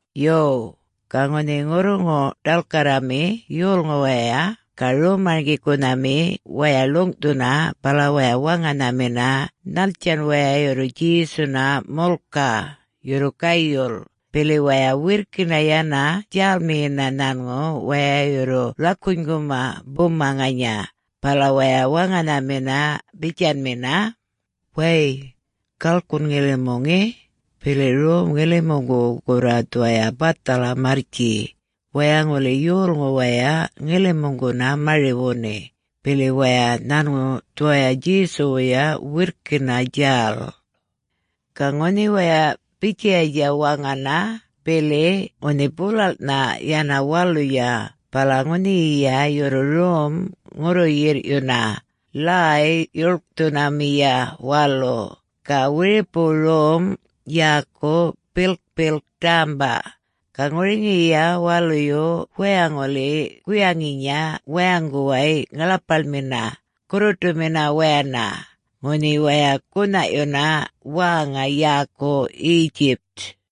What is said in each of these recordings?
Yo, ga ŋunhi ŋurruŋu-ḏalkarrami yolŋu waya ga rom-marŋgikunhami waya ḻuŋꞌthuna bala waya waŋanhamina nhattjan waya yurru Djesuna mulkaꞌ, yurru gayul, bili waya wirrkina yana djälmiyina nhanŋu waya yurru rakunyguma buma ŋanya, bala waya waŋanhamina bitjanmina, “Wäy, galkun ŋilimu ŋe, bili rom ŋilimuŋgu gurra dhuwaya bathala marrtji. Waya ŋuli yolŋu waya ŋilimuŋguna mari-wuni, bili waya nhanŋu dhuwaya Djesuwuya wirrkina djäl.” Ga ŋunhi waya bitjayatja waŋana bili ŋunhi bulalꞌnha yana waluya bala ŋunhiyiya yurru rom ŋurru-yirrꞌyuna Ḻäy-djuḻkthunamiya Walu ga wiripu rom yäku Bilkpilk Ḏämba. Ga ŋuriŋiya waluyu waya ŋuli guyaŋinya wayaŋguway ŋaḻapaḻmina, gurruṯumina wayana, ŋunhi waya gunhaꞌyuna wäŋa yäku Egypt.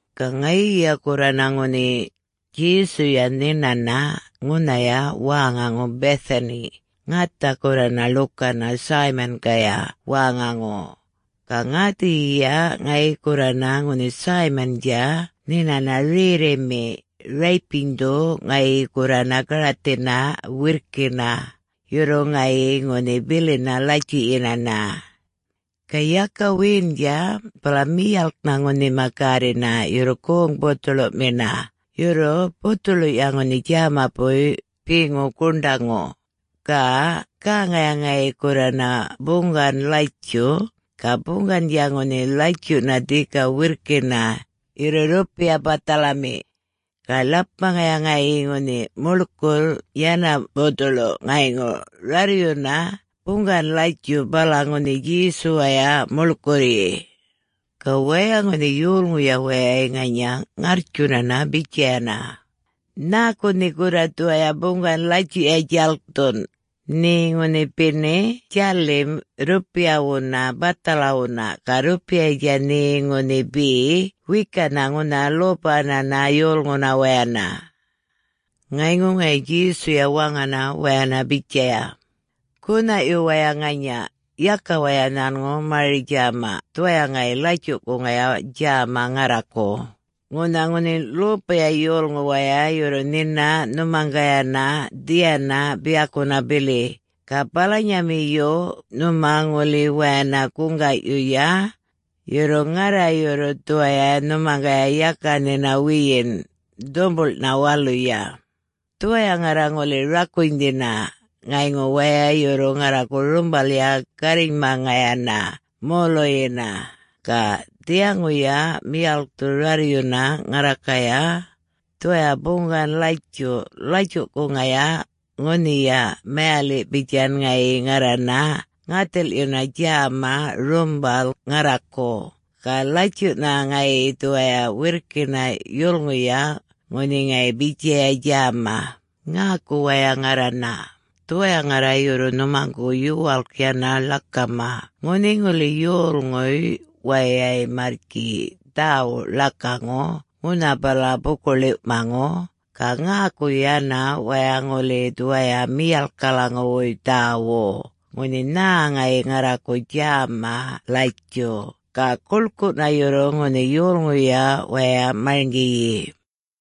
Ga ŋayiya gurrana ŋunhi Djesuya nhinana ŋunhaya wäŋaŋu Bethany, ŋatha gurrana ḻukana Simon-gaya wäŋaŋu. Ga ŋäthiyiya ŋayi gurrana ŋunhi Simon-dja nhinana rerrimi, räypinydhu ŋayi gurrana garathina wirrkina. Yurru ŋayi ŋunhi bilina latjuꞌyinana. Ga yaka wiyindja bala miyalknha ŋunhima gärrina yurru goŋ bothuḻuꞌmina, yurru bothoḻuꞌya ŋunhi djämapuy beŋu guṉḏaŋu. Ga gäŋaya ŋayi gurrana buŋgan-latjuꞌ, ga buŋgandja ŋunhi latjuꞌna dhika wirrkina, yurru rrupiya bathalami. Ga ḻapmaŋaya ŋayi ŋunhi muḻkurr yana bothuḻu, ŋayŋu rarryuna buŋgan-latjuꞌ bala ŋunhi Djesuwaya muḻkurryi. Ga waya ŋunhi yolŋuya wayay ŋanya ŋarrtjunana bitjayana, “Nhäku nhe gurra dhuwaya buŋgan-latjuꞌya djalkthun? Nhe ŋunhi beni djalim rrupiyawuna bathalawuna, ga rrupiyatja nhe ŋunhi be wekanha ŋunha lopananha yolŋuna wayana.” Ŋayŋu ŋayi Djesuya waŋana wayana bitjaya, “Gunhaꞌyu waya ŋanya. Yaka waya nhanŋu mari-djäma. Dhuwaya ŋayi latjuꞌkuŋaya djäma ŋarraku. Ŋunha ŋunhi lopaya yolŋu waya yurru nhina nhumaŋgayana dhiyana biyakuna bili, ga balanyamiyu nhuma ŋuli wayana guŋgaꞌyuya. Yurru ŋarra yurru dhuwaya nhumaŋgaya yaka nhina wiyin, dhumbuḻꞌnha waluya. Dhuwaya ŋarra ŋuli rakunydhina ŋayŋu waya yurru ŋarraku rumbalya gärrinymaŋayana moluyina. Ga dhiyaŋuya miyalkthu rarryuna ŋarrakaya dhuwaya buŋgan-latjuꞌ latjuꞌkuŋaya, ŋunhiya mayaliꞌ bitjan ŋayi ŋarrana ŋathilꞌyuna djäma rumbal ŋarraku. Ga latjuꞌna ŋayi dhuwaya wirrkina yulŋuya ŋunhi ŋayi bitjaya djäma. Ŋäku waya ŋarrana. Dhuwaya ŋarra yurru nhumaŋgu yuwalk yana ḻakama. Ŋunhi ŋuli yolŋuy wayay, marrtji dhäwuꞌ ḻakaŋu ŋunha bala buku-ḻiwꞌmaŋu, ga ŋäku yana waya ŋuli dhuwaya miyalkalaŋuwuy dhäwuꞌ, ŋunhi nhä ŋayi ŋarraku djäma latjuꞌ. Ga guḻkuꞌna yurru ŋunhi yolŋuya waya marŋgiyi.”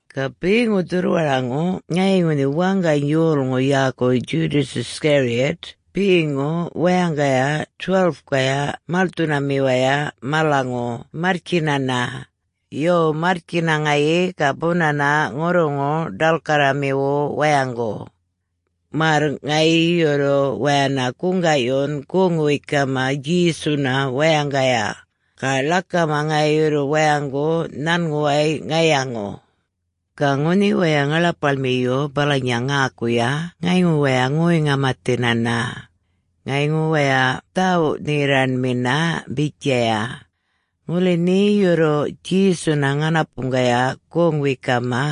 Ga beŋu dhurrwaraŋu ŋayi ŋunhi waŋgany yolŋu yäku Judas Iscariot beŋu wayaŋgaya 12-kaya malthunamiwaya malaŋu marrtjinana. Yo, marrtjina ŋayi ga bunana ŋurruŋu-ḏalkarramiwu wayaŋgu, märr ŋayi yurru wayana guŋgaꞌyun goŋ-wekama Djesuna wayaŋgaya. Ga ḻakama ŋayi yurru wayaŋgu nhanŋuway ŋayaŋu. Ga ŋunhi waya ŋaḻapaḻmiyu balanya ŋäkuya ŋayŋu waya ŋoy-ŋamathinana. Ŋayŋu waya dhawuꞌ-nherraṉmina bitjaya, “Ŋuli nhe yurru Djesuna ŋanapuŋgaya goŋ-wekama,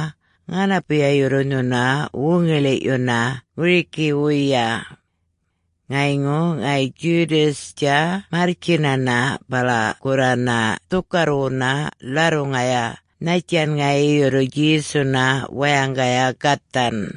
ŋanapuya yurru nhuna wuŋiḻi-yuna ŋurikiwuya.” Ŋayŋu ŋayi Judas-dja marrtjinana, bala gurrana dhukarrwuna ḻarruŋaya nhattjan ŋayi yurru Djesuna wayaŋgaya gathan.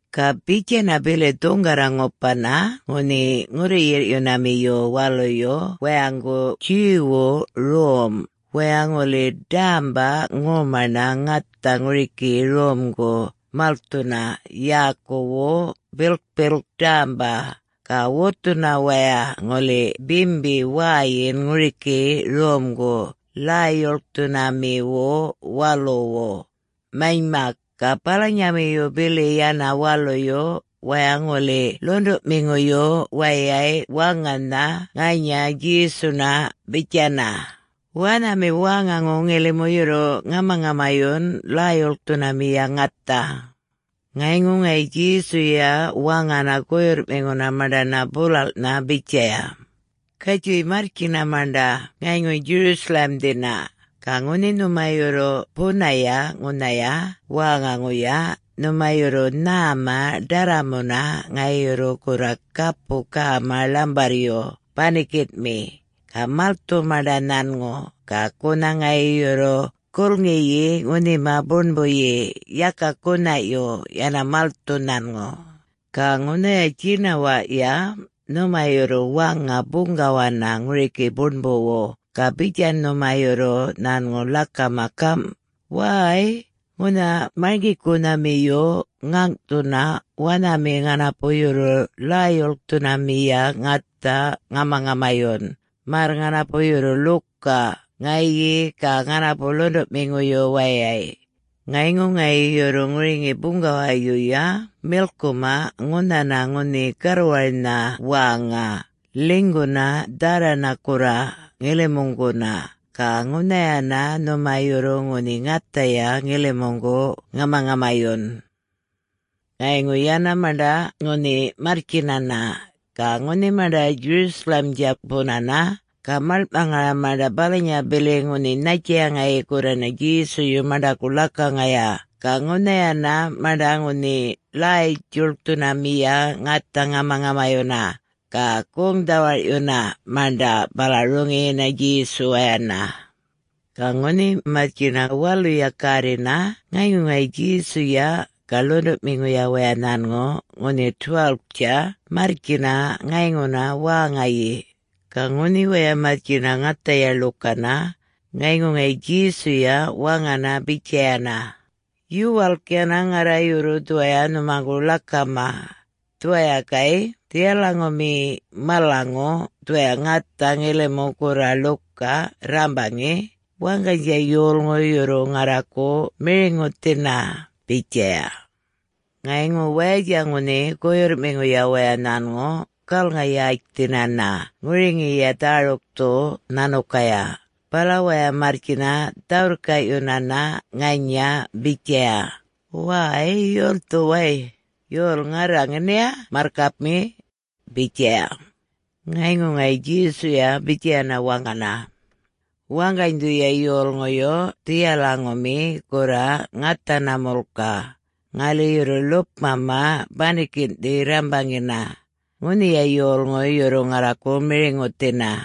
Ga bitjana bili dhuŋgarra ŋupana ŋunhi ŋurru-yirrꞌyunamiyu waluyu wayaŋgu Jew-wu rom, waya ŋuli ḏämba ŋomaṉa ŋatha ŋuriki romgu malthuna yäkuwu Bilkpilk Ḏämba, ga wutthuna waya ŋuli bimbi wäyin ŋuriki romgu Ḻäy-djuḻkthunamiwu waluwu. Manymak, ga balanyamiyu bili yana waluyu, waya ŋuli ḻuṉḏuꞌmiŋuyu wayay waŋanha ŋanya Djesuna bitjana, “Wanhami wäŋaŋu ŋilimu yurru ŋamaŋamayun Ḻäy-djuḻkthunamiya ŋatha?” Ŋayŋu ŋayi Djesuya waŋana guyurrꞌmiŋuna maṉḏana bulalꞌnha bitjaya, “Gatjuy marrtjina maṉḏa ŋayŋu Jerusalem-dhina. Ga ŋunhi nhuma yurru bunaya ŋunhaya wäŋaŋuya, nhuma yurru nhäma ḏarramuna. Ŋayi yurru gurra gapu gäma ḻambarryu banikinꞌmi. Ga malthu maṉḏa nhanŋu, ga gunha ŋayi yurru gulŋiyi ŋunhima buṉbuyi, yaka gunhaꞌyu, yana malthu nhanŋu. Ga ŋunhaya djinawaꞌya nhuma yurru waŋa buŋgawana ŋuriki buṉbuwu, ga bitjan nhuma yurru nhanŋu ḻakama gamꞌ, ‘Wäy, ŋunha Marŋgikunhamiyu ŋäŋꞌthuna wanhami ŋanapu yurru Ḻäy-djuḻkthunamiya ŋatha ŋamaŋamayun, märr ŋanapu yurru ḻuka ŋayi ga ŋanapu ḻuṉḏuꞌmiŋuyu wayay.’ Ŋayŋu ŋayi yurru ŋuriŋi buŋgawayuya milkuma ŋunhana ŋunhi garwarnha wäŋa, ḻinyguna dharrana gurra, ŋilimuŋguna, ga ŋunhayana nhuma yurru ŋunhi ŋathaya ŋilimuŋgu ŋamaŋamayun.” Ŋayŋu yana maṉḏa ŋunhi marrtjinana. Ga ŋunhi maṉḏa Jerusalem-dja bunana, ga maḻŋꞌmaŋaya maṉḏa balanya bili ŋunhi nhattjaya ŋayi gurrana Djesuyu maṉḏaku ḻakaŋaya. Ga ŋunhayana maṉḏa ŋunhi Ḻäy-djuḻkthunamiya ŋatha ŋamaŋamayuna. Ga goŋ-dhawarꞌyuna maṉḏa bala roŋiyina Djesuwayana. Ga ŋunhi marrtjina waluya gärrina ŋayŋu ŋayi Djesuya ga ḻuṉḏuꞌmiŋuya waya nhanŋu ŋunhi 12-tja marrtjina ŋayŋuna wäŋayi. Ga ŋunhi waya marrtjina ŋathaya ḻukana, ŋayŋu ŋayi Djesuya waŋana bitjayana, “Yuwalk yana ŋarra yurru dhuwaya nhumaŋgu ḻakama. Dhuwaya gayꞌ dhiyalaŋumi malaŋu dhuwaya ŋatha ŋilimu gurra ḻuka rrambaŋi, waŋganydja yolŋu yurru ŋarraku miriŋuthina,” bitjaya. Ŋayŋu wayatja ŋunhi guyurrꞌmiŋuya waya nhanŋu galŋa-yätjthinana ŋuriŋiya dhärukthu nhanukaya, bala waya marrtjina dhä-wirrkaꞌyunana ŋanya bitjaya, “Wäy,... yolthu way... yol ŋarra ŋeniya Marrkapmi?” bitjaya. Ŋayŋu ŋayi Djesuya bitjayana waŋana, “Waŋganydhuya yolŋuyu dhiyalaŋumi gurra ŋathana mulka, ŋali yurru ḻupꞌmama banikinꞌthi rrambaŋina, ŋunhiya yolŋu yurru ŋarraku miriŋuthina.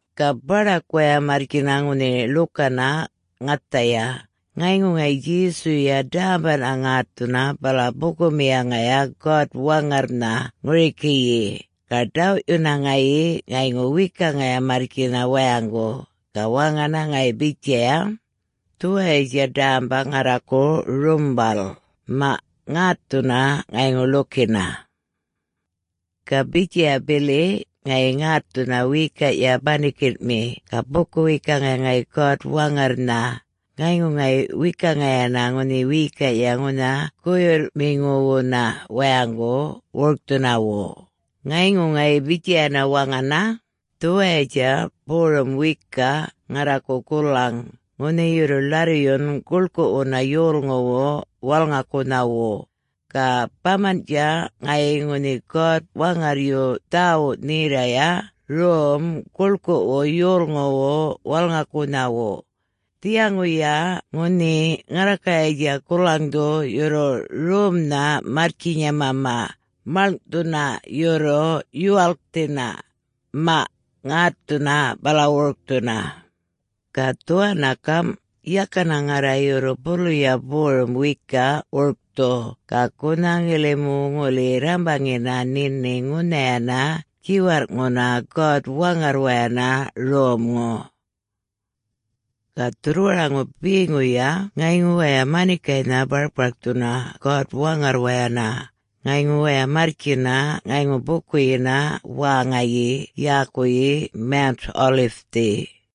Ga baḏak waya marrtjina ŋunhi ḻukana ŋathaya, ŋayŋu ŋayi Djesuya ḏämbaꞌna ŋätthuna bala bukumiyaŋaya God-Waŋarrnha ŋurikiyi. Ga ḏawꞌyuna ŋayi, ŋayŋu wekaŋaya marrtjina wayaŋgu. Ga waŋana ŋayi bitjaya, “Dhuwayatja ḏämba ŋarraku rumbal. Maꞌ, ŋätthuna ŋayŋu ḻukina.” Ga bitjaya bili ŋayi ŋätthuna wiyikaꞌya banikinꞌmi, ga buku-wekaŋaya ŋayi God-Waŋarrnha, ŋayŋu ŋayi wekaŋaya ŋunhi wiyikaꞌya ŋunha guyurrꞌmiŋuwuna wayaŋgu wurkthunawu. Ŋayŋu ŋayi bitjayana waŋana, “Dhuwayatja borum wiyikaꞌ ŋarraku gulaŋ, ŋunhi yurru ḻarryun guḻkuꞌwuna yolŋuwu walŋakunhawu. Ga bamanꞌtja ŋayi ŋunhi God-Waŋarryu dhawuꞌ-nherraya rom guḻkuꞌwu yolŋuwu walŋakunhawu. Dhiyaŋuya ŋunhi ŋarrakayatja gulaŋdhu yurru romnha marrtjinyamama, maḻŋꞌthuna yurru yuwalkthina. Maꞌ, ŋätthuna bala wurkthuna. Ga dhuwanna gamꞌ, yakana ŋarra yurru buluya borum wiyikaꞌ wurkthu, ga gunha ŋilimu ŋuli rrambaŋina nhini ŋunhayana djiwarrꞌŋuna God-Waŋarrwayana romŋu.” Ga dhurrwaraŋu beŋuya ŋayŋu waya manikaynha barkparkthuna God-Waŋarrwayana. Ŋayŋu waya marrtjina ŋayŋu bukuyina wäŋayi yäkuyi Mount-Olive-thi.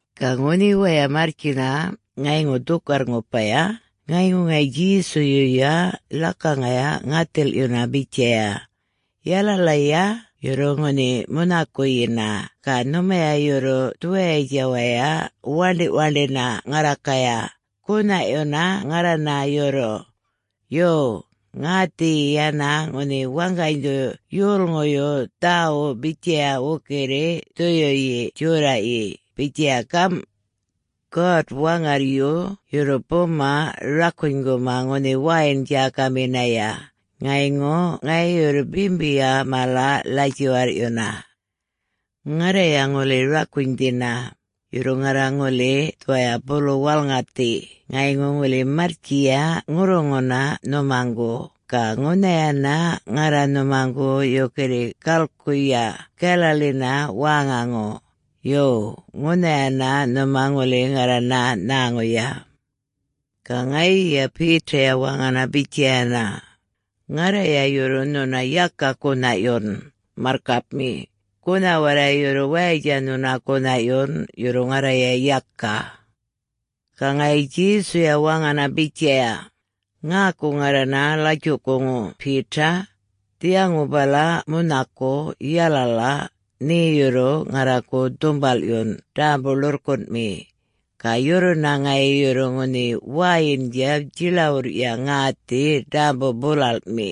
Ga ŋunhi waya marrtjina ŋayŋu dhukarr-ŋupaya, ŋayŋu ŋayi Djesuyuya ḻakaŋaya ŋathilꞌyuna bitjaya, “Yalalaya yurru ŋunhi munhakuyina ga nhumaya yurru dhuwayatja waya waṉḏiꞌ-waṉḏina ŋarrakaya, gunhaꞌyuna ŋarrana yurru. Yo, ŋäthiyi yana ŋunhi waŋganydhu yolŋuyu dhäwuꞌ bitjaya wukirri Dhuyuyi Djorraꞌyi bitjaya gamꞌ, ‘God-Waŋarryu yurru buma rakunyguma ŋunhi wäyin-djäkaminaya, ŋayŋu ŋayi yurru bimbiya mala ḻatjuwarrꞌyuna.’ Ŋarraya ŋuli rakunydhina. Yurru ŋarra ŋuli dhuwaya bulu walŋathi ŋayŋu ŋuli marrtjiya ŋurruŋuna nhumaŋgu, ga ŋunhayana ŋarra nhumaŋgu yukirri galkuyuya Galilee-na wäŋaŋu. Yo, ŋunhayana nhuma ŋuli ŋarrana nhäŋuya.” Ga ŋayiya Peter-ya waŋana bitjayana, “Ŋarraya yurru nhuna yaka gunhaꞌyun, marrkapmi, gunha warray yurru wayatja nhuna gunhaꞌyun, yurru ŋarraya yaka.” Ga ŋayi Djesuya waŋana bitjaya, “Ŋäku ŋarrana latjuꞌkuŋu Peter. Dhiyaŋu bala munhaku, yalala, nhe yurru ŋarraku dhumbalꞌyun ḏämbu-ḻurrkunꞌmi, ga yurruna ŋayi yurru ŋunhi wäyindja djiḻawurrya ŋäthi ḏämbu-bulalꞌmi.”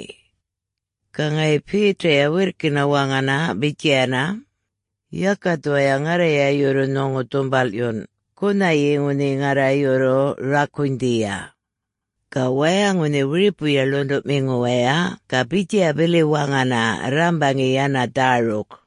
Ga ŋayi Peter-ya wirrkina waŋana bitjayana, “Yaka dhuwaya ŋarraya yurru nhuŋu dhumbalꞌyun, gunhayi ŋunhi ŋarra yurru rakunydhiya!” Ga waya ŋunhi wiripuya ḻuṉḏuꞌmiŋu waya ga bitjaya bili waŋana rrambaŋi yana dhäruk.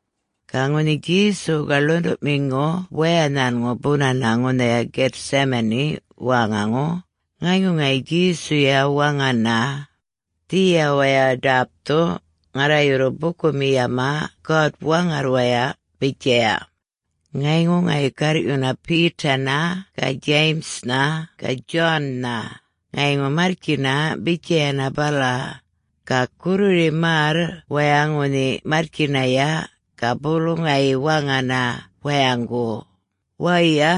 Ga ŋunhi Djesu ga ḻuṉḏuꞌmiŋu waya nhanŋu bunana ŋunhaya Gethsemane wäŋaŋu, ŋayŋu ŋayi Djesuya waŋana, “Dhiya waya ḏäpthu, ŋarra yurru bukumiyama God-Waŋarrwaya,” bitjaya. Ŋayŋu ŋayi garrꞌyuna Peter-na ga James-na ga John-na, ŋayŋu marrtjina bitjayana bala. Ga gurriri märr waya ŋunhi marrtjinaya, ga bulu ŋayi waŋana wayaŋgu, “Waya,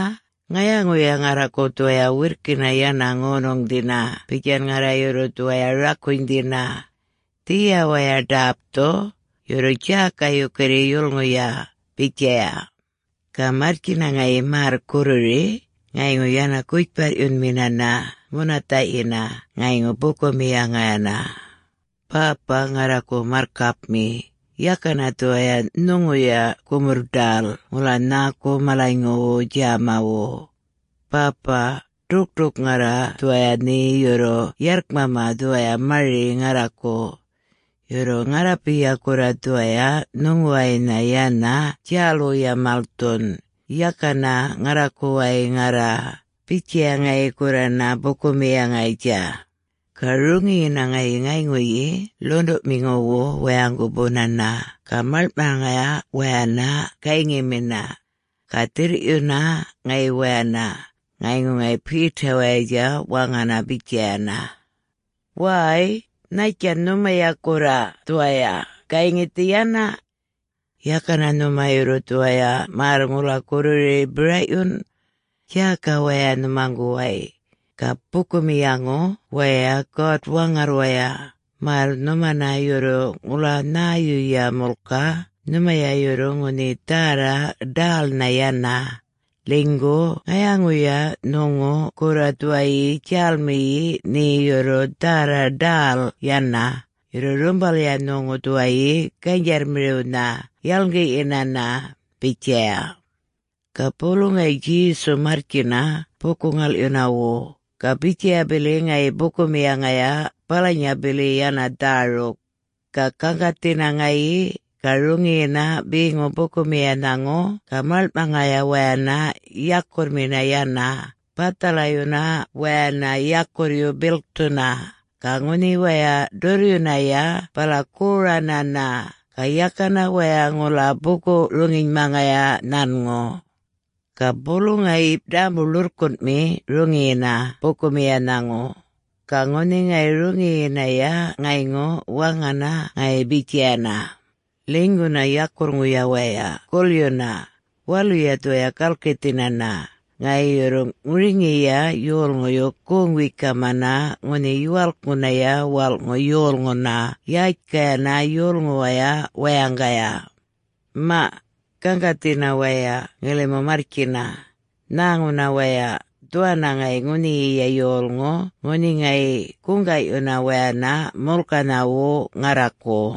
ŋayaŋuya ŋarraku dhuwaya wirrkina yana ŋonuŋdhina bitjan ŋarra yurru dhuwaya rakunydhina. Dhiya waya ḏäpthu, yurru djäka yukirri yulŋuya,” bitjaya. Ga marrtjina ŋayi märr gurriri, ŋayŋu yana gutjparryunminana munathaꞌyina ŋayŋu bukumiyaŋayana, “Bäpa ŋarraku marrkapmi, yakana dhuwaya nhuŋuya gumurr-ḏäl ŋula nhäku malanyŋuwu djämawu. Bäpaꞌ, ḏukṯuk ŋarra dhuwaya nhe yurru yarrkmama dhuwaya mari ŋarraku. Yurru ŋarrapiya gurra dhuwaya nhuŋuwaynha yana djälwuya malthun, yakana ŋarrakuwaya ŋarra,” bitjaya ŋayi gurrana bukumiyaŋayatja. Ga roŋiyina ŋayi ŋayŋuyi luṉḏuꞌmiŋuwu wayaŋgu bunana ga maḻŋꞌmaŋaya wayana gayŋimina. Ga dhirrꞌyuna ŋayi wayana, ŋayŋu ŋayi Peter-wayatja waŋana bitjayana, “Wäy, nhattjan nhumaya gurra dhuwaya, gayŋithi yana? Yakana nhuma yurru dhuwaya märr ŋula gurriri biraꞌyun? Djäka waya nhumaŋguway, ga bukumiyaŋu waya God-Waŋarrwaya märr nhumana yurru ŋula nhäyuya mulka, nhumaya yurru ŋunhi dhärra ḏälnha yana. Ḻinygu ŋayaŋuya nhuŋu gurra dhuwayi djälmiyi nhe yurru dhärra ḏäl yana, yurru rumbalya nhuŋu dhuwayi ganydjarrmiriwnha yalŋgiꞌyinana,” bitjaya. Ga bulu ŋayi Djesu marrtjina buku-ŋalꞌyunawu, ga bitjaya bili ŋayi bukumiyaŋaya balanya bili yana dhäruk. Ga gaŋgathina ŋayi, ga roŋiyina beŋu bukumiyanhaŋu ga maḻŋꞌmaŋaya wayana yakurrmina yana, bathalayuna wayana yakurryu bilkthuna. Ga ŋunhi waya ḏurryunaya bala goranana, ga yakana waya ŋula buku-roŋinymaŋaya nhanŋu. Ga bulu ŋayi ḏämbu-ḻurrkunꞌmi roŋiyina bukumiyanhaŋu. Ga ŋunhi ŋayi roŋiyinaya ŋayŋu waŋana ŋayi bitjayana, “Ḻinyguna yakurrŋuya waya gulyuna! Waluya dhuwaya galkithinana, ŋayi yurru ŋuriŋiya yolŋuyu goŋ-wekamana ŋunhi Yuwalkŋunaya Walꞌŋu Yolŋuna yätjkayana yolŋuwaya wayaŋgaya. Maꞌ! Gaŋgathina waya ŋilimu marrtjina. Nhäŋuna waya, dhuwanna ŋayi ŋunhiyiya yolŋu ŋunhi ŋayi guŋgaꞌyuna wayana mulkanhawu ŋarraku.”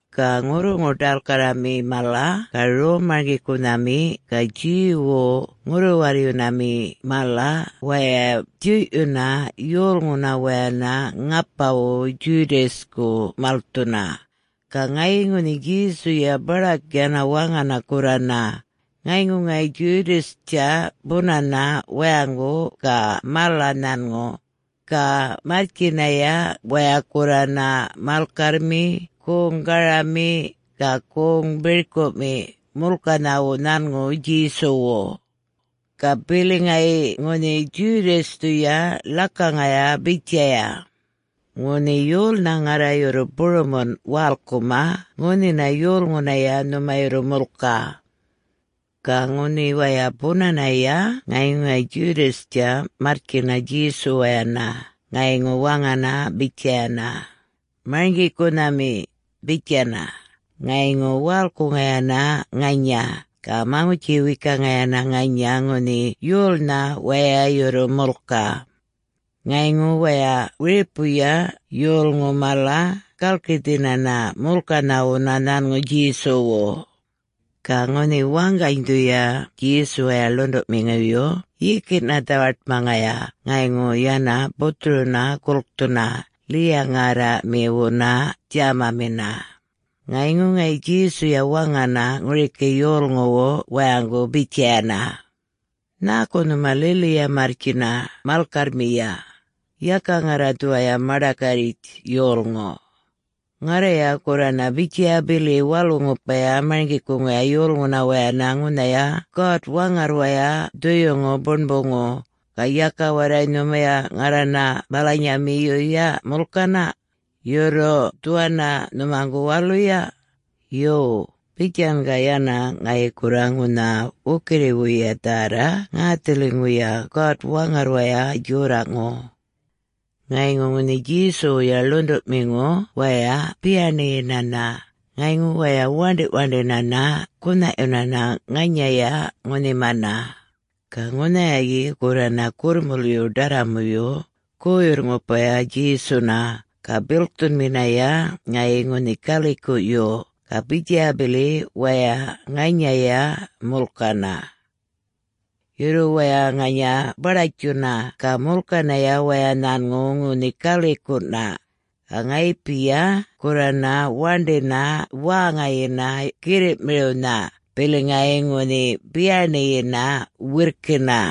Ga ŋurruŋu-ḏalkarrami mala ga rom-marŋgikunhami ga Jew-wu ŋurru-warryunami mala waya djuyꞌyuna yolŋuna wayana ŋapawu Judas-ku malthuna. Ga ŋayi ŋunhi Djesuya baḏak yana waŋana gurrana, ŋayŋu ŋayi Judas-tja bunana wayaŋgu ga mala nhanŋu. Ga marrtjinaya waya gurrana malkarrmi, goŋ garami, ga goŋ birkuꞌmi, mulkanhawu nhanŋu Djesuwu. Ga bili ŋayi ŋunhi Judas-thuya ḻakaŋaya bitjaya, “Ŋunhi yolnha ŋarra yurru burumunꞌ walkuma ŋunhina yolŋunaya nhuma yurru mulkaꞌ.” Ga ŋunhi waya bunanaya ŋayŋu ŋayi Judas-tja marrtjina Djesuwayana ŋayŋu waŋana bitjayana, “Marŋgikunhami,” bitjana, ŋayŋu walkuŋayana ŋanya, ga maŋutji-wekaŋayana ŋanya ŋunhi yolnha waya yurru mulkaꞌ. Ŋayŋu waya wiripuya yolŋu mala galkithinana mulkanhawuna nhanŋu Djesuwu. Ga ŋunhi waŋganydhuya Djesuwaya ḻuṉḏuꞌmiŋuyu yikiꞌna dhawaṯmaŋaya ŋayŋu yana buthuruna gulkthuna, ḻiya-ŋärraꞌmiwuna djämamina. Ŋayŋu ŋayi Djesuya waŋana ŋuriki yolŋuwu wayaŋgu bitjayana, “Nhäku nhuma liliya marrtjina malkarrmiya? Yaka ŋarra dhuwaya maḏakarritj yolŋu. Ŋarraya gurrana bitjaya bili walu-ŋupaya marŋgikuŋaya yolŋuna wayana ŋunhaya God-Waŋarrwaya Dhuyuŋu Buṉbuŋu, ga yaka warray nhumaya ŋarrana balanyamiyuya mulkana... yurru dhuwanna nhumaŋgu waluya. Yo, bitjan ga yana ŋayi gurra ŋunha wukirriwuya dhärra ŋäthiliŋuya God-Waŋarrwaya Djorraꞌŋu.” Ŋayŋu ŋunhi Djesuwuya ḻuṉḏuꞌmiŋu waya biyaṉiyinana ŋayŋu waya waṉḏiꞌwaṉḏinana, gunhaꞌyunana ŋanyaya ŋunhimana. Ga ŋunhayayi gurrana gurrmulyu ḏarramuyu guyurr-ŋupaya Djesuna, ga bilkthunminaya ŋayi ŋunhi galikuꞌyu. Ga bitjaya bili waya ŋanyaya mulkana. Yurru waya ŋanya baḏatjuna ga mulkanaya waya nhanŋu ŋunhi galikuꞌna. Ga ŋayipiya gurrana waṉḏina wäŋayina girriꞌmiriwnha, bili ŋayi ŋunhi biyaṉiyina wirrkina.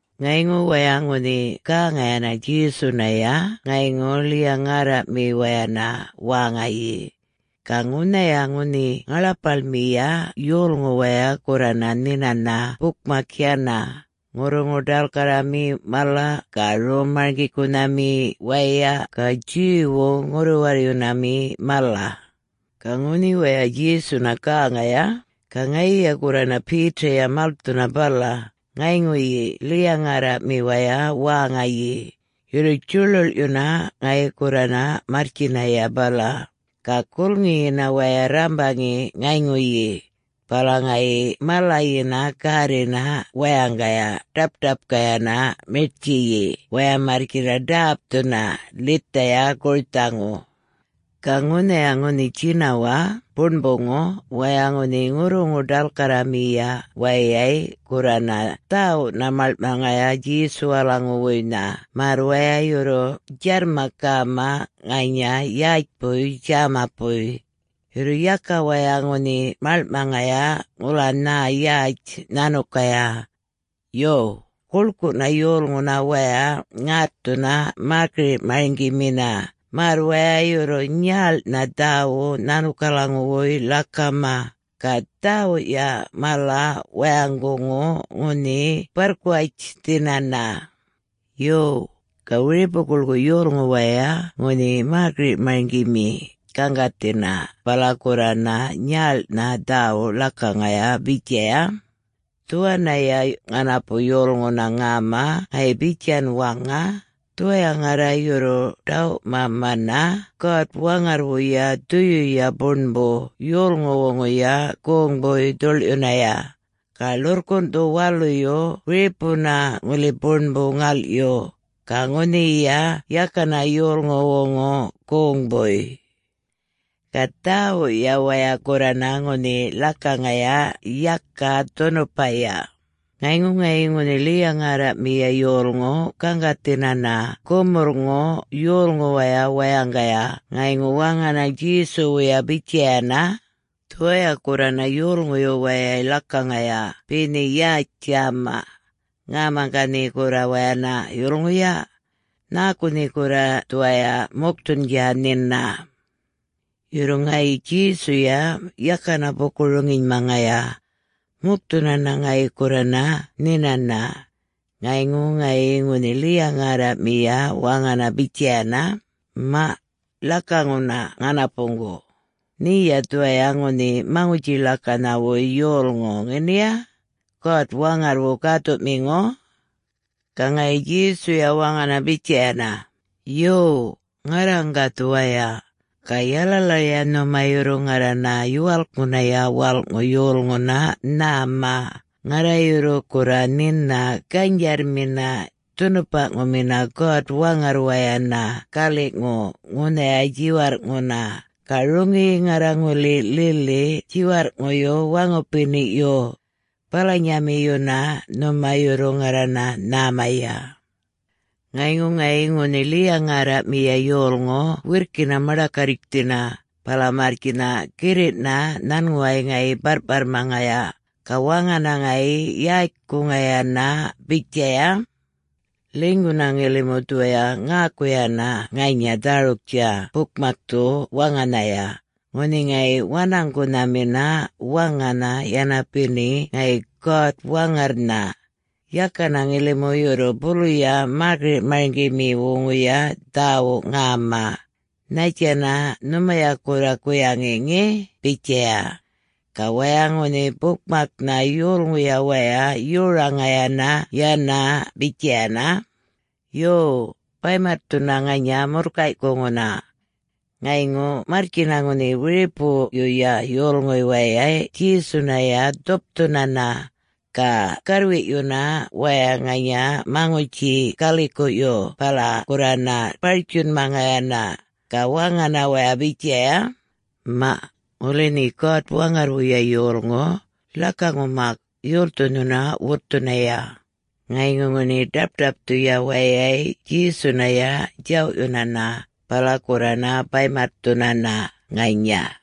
Ŋayŋu waya ŋunhi gäŋayana Djesunaya ŋayŋu ḻiya-ŋärraꞌmiwayana wäŋayi. Ga ŋunhaya ŋunhi ŋaḻapaḻmiya yolŋu waya gurrana nhinana bukmak yana, ŋurruŋu-ḏalkarrami mala ga rom-marŋgikunhami waya ga Jew-wu ŋurru-warryunami mala. Ga ŋunhi waya Djesuna gäŋaya, ga ŋayiya gurrana Peter-ya malthuna bala, ŋayŋuyi ḻiya-ŋärraꞌmiwaya wäŋayi, yurru djuḻuḻꞌyuna ŋayi gurrana marrtjinaya bala. Ga gulŋiyina waya rrambaŋi ŋayŋuyi, bala ŋayi malayina gärrina wayaŋgaya ḏap-ṯapkayana miṯtjiyi waya marrtjina ḏäpthuna ḻithaya gurthaŋu. Ga ŋunhaya ŋunhi djinawaꞌ buṉbuŋu waya ŋunhi ŋurruŋu-ḏalkarramiya wayay gurrana dhäwuꞌna maḻŋꞌmaŋaya Djesuwalaŋuwuynha märr waya yurru djarrma-gäma ŋanya yätjpuy djämapuy. Yurru yaka waya ŋunhi malŋꞌmaŋaya ŋula nhä yatj nhanukaya. Yo, guḻkuꞌna yolŋuna waya ŋätthuna mäkiriꞌ-marŋgimina märr waya yurru nyäḻꞌnha dhäwuꞌ nhanukalaŋuwuy ḻakama, ga dhäwuꞌya mala wayaŋguŋu ŋunhi barrkuwatjthinana. Yo, ga wiripu-guḻkuꞌ yolŋu waya ŋunhi mäkiriꞌ-marŋgimi gaŋgathina bala gurrana nyälꞌnha dhäwuꞌ ḻakaŋaya bitjaya, “Dhuwanaya ŋanapu yolŋuna ŋäma ŋayi bitjan waŋa, ‘Dhuwaya ŋarra yurru ḏawꞌmamana God-Waŋarrwuya Dhuyuya Buṉbu yolŋuwuŋuya goŋbuy dhuḻꞌyunaya. Ga ḻurrkunꞌthu waluyu wiripuna ŋuli buṉbu ŋalꞌyu, ga ŋunhiya yakana yolŋuwuŋu goŋbuy.’” Ga dhäwuꞌya waya gurrana ŋunhi ḻakaŋaya yaka dhunupaya. Ŋayŋu ŋayi ŋunhi ḻiya-ŋärraꞌmiya yolŋu gaŋgathinana gumurrŋu yolŋuwaya wayaŋgaya ŋayŋu waŋana Djesuwuya bitjayana, “Dhuwaya gurrana yolŋuyu wayay ḻakaŋaya be nhe yätj djäma. Ŋäma ga nhe gurra wayana yulŋuya? Nhäku nhe gurra dhuwaya mukthundja nhina?” Yurru ŋayi Djesuya yakana buku-roŋinymaŋaya. Mukthunana ŋayi gurrana nhinana. Ŋayŋu ŋayi ŋunhi ḻiya-ŋärraꞌmiya waŋana bitjayana, “Maꞌ, ḻakaŋuna ŋanapuŋgu. Nheya dhuwaya ŋunhi Maŋutji-ḻakanhawuy yolŋu ŋeniya... God-Waŋarrwu gäthuꞌmiŋu?” Ga ŋayi Djesuya waŋana bitjayana, “Yo, ŋarraŋga dhuwaya. Ga yalalaya nhuma yurru ŋarrana Yuwalkŋunaya Walꞌŋu Yolŋuna nhäma, ŋarra yurru gurra nhina ganydjarrmina, dhunupaꞌŋumina God-Waŋarrwayana galiꞌŋu ŋunhaya djiwarrꞌŋuna. Ga roŋiyi ŋarra ŋuli lili djiwarrꞌŋuyu waŋupiniꞌyu. Balanyamiyuna nhuma yurru ŋarrana nhämaya.” Ŋayŋu ŋayi ŋunhi ḻiya-ŋärraꞌmiya yolŋu wirrkina maḏakarritjthina, bala marrtjina girriꞌna nhanŋuway ŋayi barrꞌparrmaŋaya, ga waŋana ŋayi yätjkuŋayana bitjaya, “Ḻinyguna ŋilimu dhuwaya ŋäkuyana ŋanya dhäruktja bukmakthu waŋanhaya, ŋunhi ŋayi wanaŋgunhamina waŋana yana beni ŋayi God-Waŋarrnha. Yakana ŋilimu yurru buluya mäkiriꞌ-marŋgimiwuŋuya dhäwuꞌ ŋäma. Nhattjana nhumaya gurra guyaŋi ŋe?” bitjaya. Ga waya ŋunhi bukmaknha yolŋuya waya yoraŋayana yana bitjayana, “Yo, baymatthuna ŋanya murrkayꞌkuŋuna.” Ŋayŋu marrtjina ŋunhi wiripuyuya yolŋuy wayay Djesunaya dhupthunana. Ga garrwiꞌyuna waya ŋanya maŋutji galikuꞌyu bala gurrana bartjunmaŋayana, ga waŋana waya bitjaya, “Maꞌ, ŋuli nhe God-Waŋarrwuya yolŋu, ḻakaŋu mak, yolthu nhuna wutthunaya?” Ŋayŋu ŋunhi ḏapṯapthuya wayay Djesunaya djawꞌyunana, bala gurrana baymatthunana ŋanya.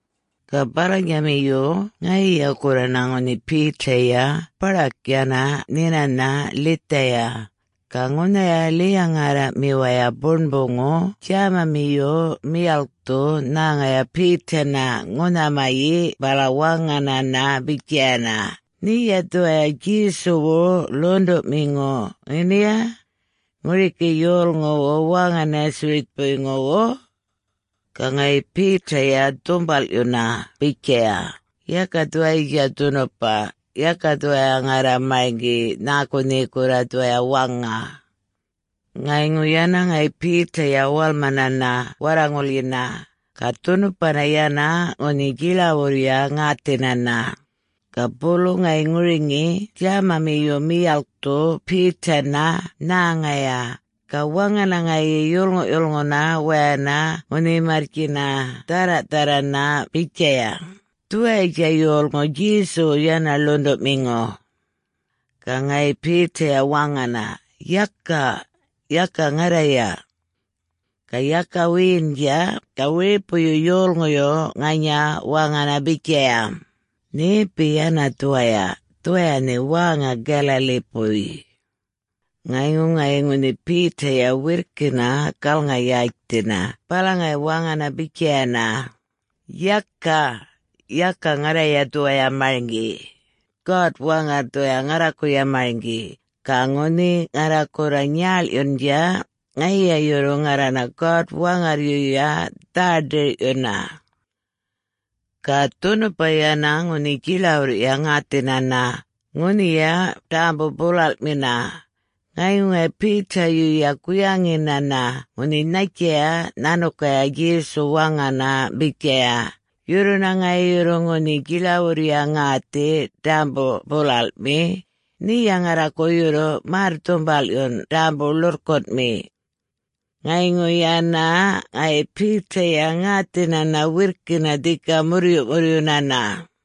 Ga balanyamiyu ŋayiya gurrana ŋunhi Peter-ya baḏak yana nhinana ḻithaya. Ga ŋunhaya ḻiya-ŋärraꞌmiwaya buṉbuŋu djämamiyu miyalkthu nhäŋaya Peter-na ŋunhamayi bala waŋanana bitjayana, “Nheya dhuwaya Djesuwu ḻuṉḏuꞌmiŋu ŋeniya?... ŋuriki yolŋuwu wäŋa Nazareth-puyŋuwu?” Ga ŋayi Peter-ya dhumbalꞌyuna bitjaya, “Yaka dhuwayitja dhunupa. Yaka dhuwaya ŋarra marŋgi nhäku nhe gurra dhuwaya waŋa.” Ŋayŋu yana ŋayi Peter-ya walmanana warraŋulyina, [ga dhunupana yana ŋunhi djiḻawurrya ŋäthinana.] Ga bulu ŋayi ŋuriŋi djämamiyu miyalkthu Peter-na nhäŋaya, ga waŋana ŋayi yolŋuꞌyulŋuna wayana ŋunhi marrtjina dhärra-dharrana bitjaya, “Dhuwayatja yolŋu Djesuwu yana ḻuṉḏuꞌmiŋu.” Ga ŋayi Peter-ya waŋana, “Yaka!... yaka ŋarraya!” Ga yaka wiyindja ga wiripuyu yolŋuyu ŋanya waŋana bitjaya, “Nhepi yana dhuwaya, dhuwaya nhe wäŋa Galilee-puy.” Ŋayŋu ŋayi ŋunhi Peter-ya wirrkina galŋa-yätjthina bala ŋayi waŋana bitjayana, “Yaka, yaka ŋarraya dhuwaya marŋgi. God-Waŋarr dhuwaya ŋarrakuya marŋgi, ga ŋunhi ŋarra gurra nyäḻꞌyundja, ŋayiya yurru ŋarrana God-Waŋarryuya dhä-dirꞌyuna.” Ga dhunupa yana ŋunhi djiḻawurrya ŋäthinana, ŋunhiya ḏämbu-bulalꞌmina. Ŋayŋu ŋayi Peter-yuya guyaŋinana ŋunhi nhattjaya nhanukaya Djesu waŋana bitjaya, “Yurruna ŋayi yurru ŋunhi djiḻawurrya ŋäthi ḏämbu-bulalꞌmi, nheya ŋarraku yurru märr-dhumbalꞌyun ḏämbu-ḻurrkunꞌmi.” Ŋayŋu yana ŋayi Peter-ya ŋäthinana wirrkina dhika murryuꞌmurryunana.